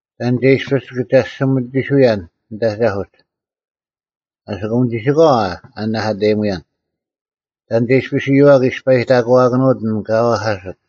ᑕᓐ ᒐ ᐃᔅᐱᔅ ᑭᒐᔅᒋᒥᑎᓱᔭᓐ ᓂᑦ ᐊᒐᐧᑯᒡ, ᐊᓯᑯᒻ ᒋᓯᑲᐛ ᐊ ᐊ ᓂᓇᐧᑲᑕᔨᒧᔭᓐ? ᑕᓐ ᒐ ᐃᔅᐱᔅ ᐊᔪᐛᒃ ᐃᔅᐸᐃᑕᒂᑭᓄᐅᑦ ᐊᓐ ᑲ ᐛᐧᑲᓯᑦ?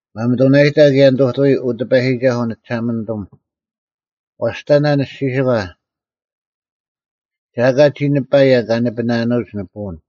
ᒪᒥᑐᓇᔨᒥ ᑭᔭ ᓂᑐᑐᐎ, ᐅ ᑎᐸᔨᒋᒐᓱᐤ, ᓂᒋᓴᒪᓂᑐᒻ: ᐛᔅᑕᓇ ᓂᔅᒋᓯᒂ, ᒐ ᐊᑲ ᒋ ᓂᐸᔭᓐ ᑲᓂᐱᓇᓄᐅᒡ ᓂᐸᐅᓐ,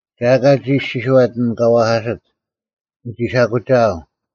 ᒐ ᐊᑲ ᒋ ᐃᔅᒋᔄᑦ ᐊᓐ ᑲ ᐛᐧᑲᓯᑦ, “ᓂᒋ ᓴᐧᑯᒋᐊᐤ,”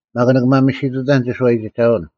ᒪᒃ ᓂᒋ ᒪᒥᓯᑐᑕᓐ ᒋᓱᐛᔨᒋᒐᐅᓐ;